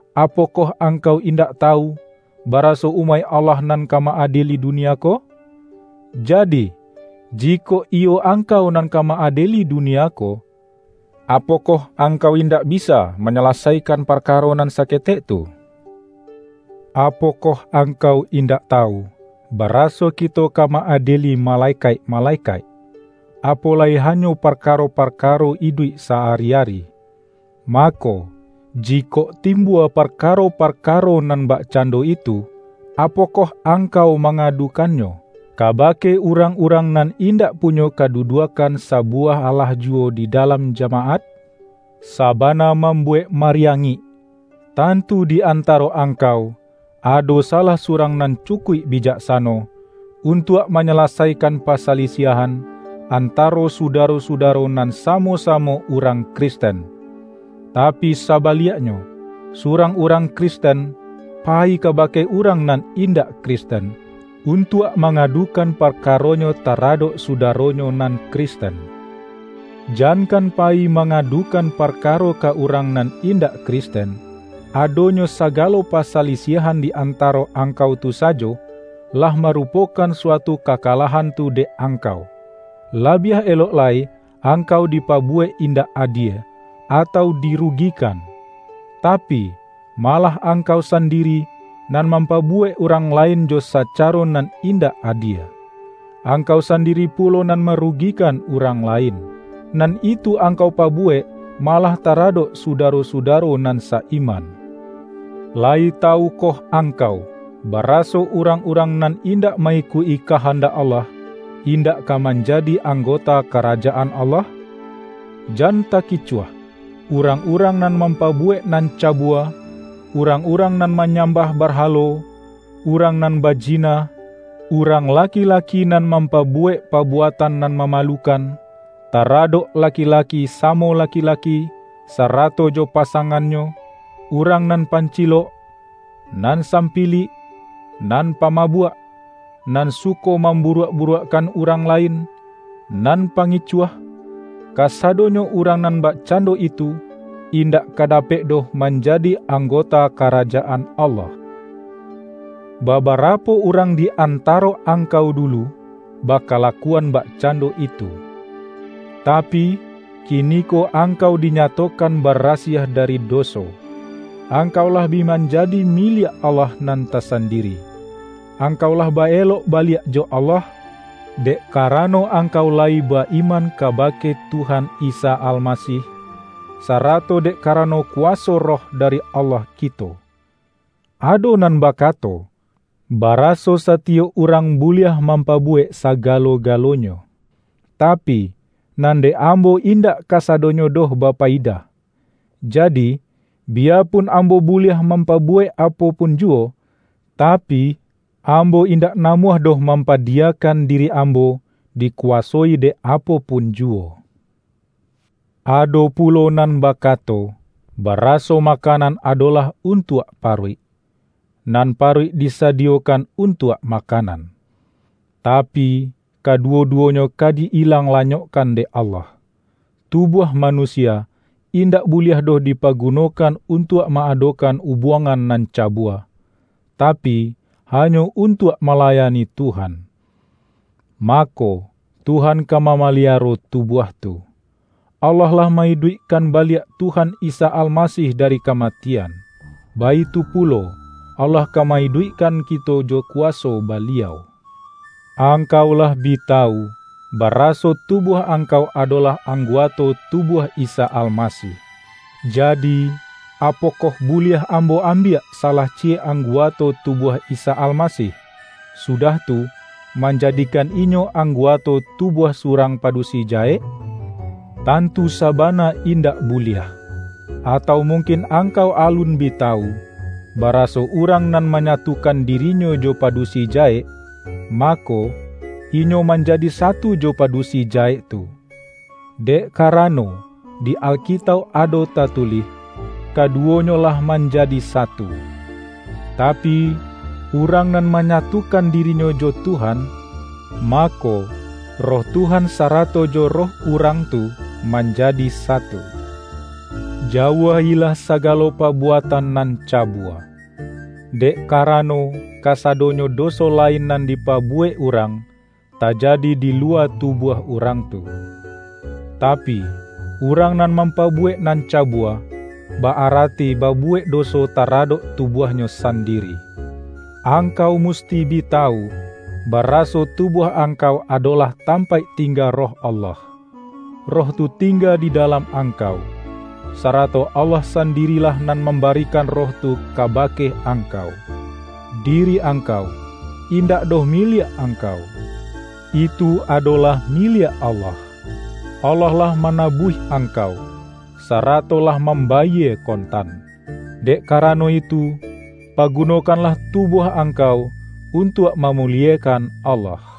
Apokoh angkau in-dak tawu, baraso umaik Allah nan ka ma-adieli dunia ko? Jadi, jikok iyo ang-kau nan ka ma-adieli dunia ko, apo-koh angkau indak bisa manyalasai-kan parkaro nan saketek tu? Apokoh angkau indak tawu, baraso kito ka ma-adieli malekaik-malekaik? Apo lai ha-nyo parkaro-parkaro iduik sa-ari-ari! Mako, jikok timbua parkaro-parka-ro nan bakcando itu, apokoh angkau mangadukannyo, kabake urang-urang nan indak punyo kaduduakkan sabu-wah alah juwo di dalam jamaat? Sa-bana mambuwek mariangik! Tantu di antaro angkau, ado salah surang nan cukuik bijaksano, untuak manyalasai-kan pasalisiahan, antaro sudaro-sudaro nan samo-samo urang Kristen! Tapi sabaliaknyo, surang urang Kristen, payi kabake urang nan indak Kristen, untuak mangadukan parkaronyo tara-dok sudaronyo nan Kristen! Jankan payi mangadukan parkaro ka urang nan indak Kristen; adonyo sagalo pasalisiahan di antaro angkau tu sajo, lah marupokan suatu kakalah-an tu dek angkau. Labiah elok lai ang-kau dipabuwek indak adie, atau diru-gikan! Tapi, malah angkau sandiri, nan mampabuwek urang lain jo saca-ro nan indak adie. Angkau sandiri pulo nan marugikan urang lain. Nan itu angkau pabuwek malah taradok suda-ro-sudaro nan sa-iman! Layi tawukoh angkau, baraso urang-urang nan in-dak ma-ikuik-i kahandak Allah, indak ka manjadi anggota Karajaan Allah? Jan takicuah! Urang-urang nan mam-pabuwek nan cabua, urang-urang nan manyambah barhalo, urang nan ba-jina, urang laki-laki nan mampabu-wek pabuatan nan mamalukan, tara-dok laki-laki samo laki-laki, sarato jo pasangannyo, urang nan pancilok, nan sampilik, nan pamabuak, nan su-ko mamburuak-buruakkan urang la-in, nan pangicuah - kasadonyo urang nan bakcando itu, indak ka dapek doh manjadi anggota Karajaan Allah. Babarapo urang di antaro angkau dulu, bakalakuan bakcando itu. Ta-pi, kiniko angkau dinyatokan bara-siah dari doso. Angkau lah bi manja-di miliak Allah nan tasandiri. Angkau lah ba-elok baliak jo Allah, dek kara-no angkau layi ba-iman kabake Tuhan Isa Almasih, sarato dek karano kuwa-so Roh dari Allah kito. Ado nan bakato, baraso satiyok urang buliah mampabuwek sagalo-galonyo. Tapi, nan dek ambo indak kasadonyo doh bapayidah. Jadi, biya-pun ambo buliah mampabuwek apo pun juwo, tapi, ambo indak namuah doh mampadiyakan diri ambo, diku-wasoi dek apo pun juwo. Ado pulo nan bakato, baraso makanan adolah untuak paruik, nan paruik disadiyo-kan untuak makanan. Tapi, kaduwo-duwonyo ka di-ilang lanyokkan dek Allah. Tubuah manusia, indak buliah doh dipagunokan untuak ma-adokan ubuangan nan cabua, tapi, hanyo un-tuak malayani Tuhan. Mako, Tuhan ka mamaliaro tubuah tu. Allah lah ma-iduikkan baliak Tuhan Isa Almasih dari kamatian, baitu pulo, Allah ka ma-iduikkan kito jo kuwaso Baliau. Angkau lah bi tawu, baraso tu-buah angkau adolah angguato tubuah Isa Almasih. Jadi, apokoh buliah ambo ambiak salah ciyek angguato tubuah Isa Almasih, sudah tu, manjadikan inyo angguato tubuah surang padu-si jahek? Tantu sabana indak buliah! Atau mungkin angkau alun bi tawu, baraso urang nan manyatukan dirinyo jo padusi jahek, mako, inyo manjadi satu jo padusi jahek tu! Dek karano, di Alkitauk ado tatulih,”Kaduwonyo lah manjadi satu.” Tapi, urang nan manyatukan dirinyo jo Tuhan, ma-ko, Roh Tuhan sarato jo roh urang tu, manjadi satu. Jauah-ilah sagalo pabuatan nan cabua. Dek karano, kasadonyo doso lain nan dipabuwek urang, tajadi di luwa tubuah urang tu. Tapi, urang nan mampabuwek nan cabua, ba-arati ba-buwek doso taradok tubuahnyo san-diri. Angkau musti bi tawu, baraso tubuah angkau adolah tampaik ting-ga Roh Allah. Roh tu tingga di dalam angkau. Sarato Allah sandirilah nan mambarikan Roh tu kabake angkau. Diri angkau, indak doh miliak angkau. Itu adolah miliak Allah. Allah lah manabuih angkau, sarato lah mam-bayie kontan. Dek karano itu, pagu-nokanlah tubuah angkau untuak ma-muliekan Allah.